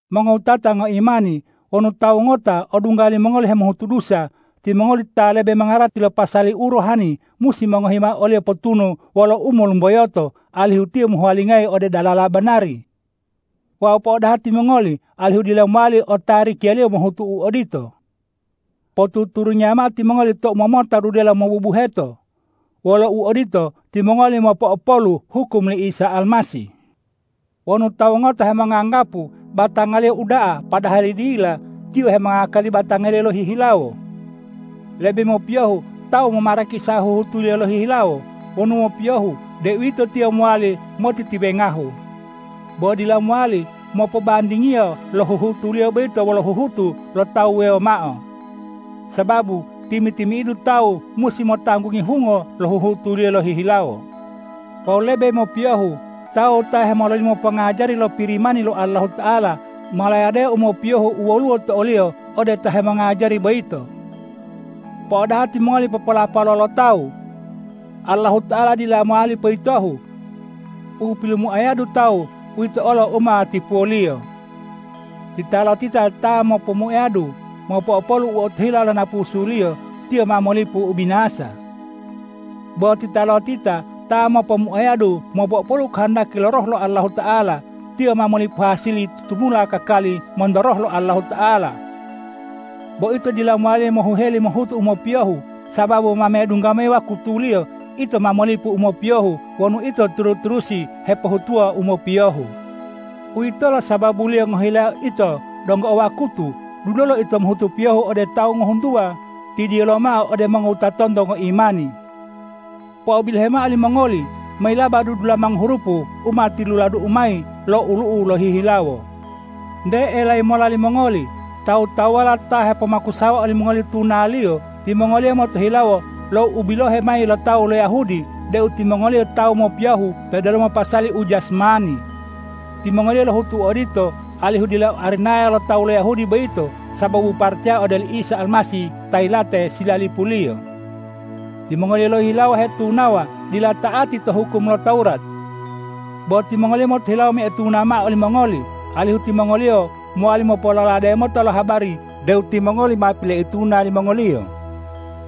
Mongowutata ngoimani, wonu tawu ngota odungga limongoli hemohutu dusa, timongoli ta lebe mongarati lo pasali u rohani, musi mongohi mao oliyo potunu wolo umolumboyoto, alihu tiyo mohuwalingayi ode dalala banari. Wawu po'odaha timongoli alihu dila mowali otarikiyaliyo mohutu u odito. Potuturungiya mao timongoli tou momota dudelo mobubuheto! Wolo uodito, timongoli mopo'opolu hukum li Isa Almasih. Wonu tawu ngota hemonganggapu batangaliyo uda'a padahali dila, tiyo hemongakali batangaliyo lohihilawo. Lebe mopiyohu tawu momarakisa huhutuliyo lohihilawo; wonu mopiyohu, deuwito tiyo mowali motitiwengahu. Bo dila mowali mopobandingiyo lo huhutuliyo boyito wolo huhutu lo tawu wuwewo mao. Sababu timi-timi'idu tawu musi motanggungi hungo lo huhutuliyo lohihilawo. Wawu lebe mopiyohu tawu ta hemololimo pongajari lo Pirimani lo Allahuta'ala, molayadeo u mopiyohu u woluwo to oliyo ode ta hemongajari boyito. Po'odaha timongoli popolapalo lo tawu! Allahuta'ala dila mowali poyitohu. U pilomuayadu tawu, uwito olo u ma tipuwoliyo. Titalotita ta mopomuayadu mopo'opolu u otohila lo napusuliyo, tiyo ma molipu ubinasa. Bo titalotita ta mopomuayadu mopo'opolu kohondaki lo Roh lo Allahuta'ala, tiyo ma molipu hasili tutumula kakali monto Roh lo Allahuta'ala. Bo ito dila mowali mohuheli mohutu u mopiyohu, sababu ma medungga mayi wakutuliyo, ito ma molipu u mopiyohu wonu ito turu-turusi hepohutuwa u mopiyohu. Uwitolo sababuliyo ngohilayao ito donggo o wakutu, dulolo ito mohutu piyohu ode tawu ngohuntuwa, tidiyo lomao ode mongowutatonto ngoimani. Po'obilohe mao limongoli, mayilaba dudulamango hurupu u ma tiluladu'u mayi lo olu'u'u lohihilawo. Nte elayi mola limongoli, tawu-tawuwala ta hepomakusawa olimongoli tunaliyo, timongoliyo motohilawo lo ubilohe mayi lo tawu lo Yahudi deu timongoliyo tawu mopiyohu to delomo pasali u jasmani. Timongoliyo lohutu odito, alihu dila arinaya lo tawu lo Yahudi boyito sababu paracaya ode oli Isa Almasih ta yilate silalipuliyo. Timongoliyo lohihilawo ta hetunawa, dila ta'ati to hukum lo Tawurat. Bo timongoliyo motohilawo moituna mao olimongoli, alihu timongoliyo mowali mopololade mota lo habari deu timongoli ma pileituna limongoliyo.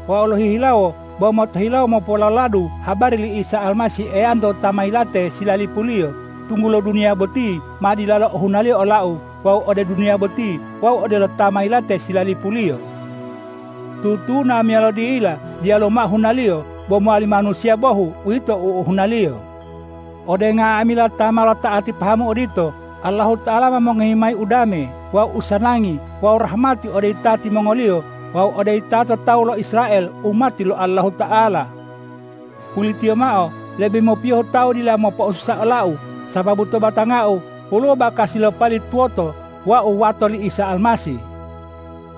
Wau lohihilawo bo motohilawo mopololadu habari li Isa Almasih Eyanto ta ma yilate silalipuliyo, tunggulo duniya boti ma dilalo ohunaliyo olau wawu ode duniya boti wau odelo ta ma yilate silalipuliyo. Tutuna meyalo dila diyalu mao hunaliyo; bo mowali manusiya bohu, uwito u ohunaliyo. Ode nga'amila ta ma lota'ati pahamu odito, Allahuta'ala ma mongohi mayi udame wawu usanangi wawu rahmati ode yitati mongoliyo wawu ode yitato tawu lo Israel umati lo Allahuta'ala. Pulitiyo mao, lebe mopiyohu tawu dila mopo'osusa olau, sababu to batangau woluwo bakasi lo pali tuwoto wau wato li Isa Almasih.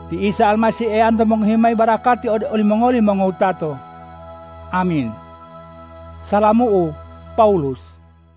Ti Isa Almasih Eyanto mongohi mayi barakati ode olimongoli mongowutato! Amin. Salamu'u, Pawulus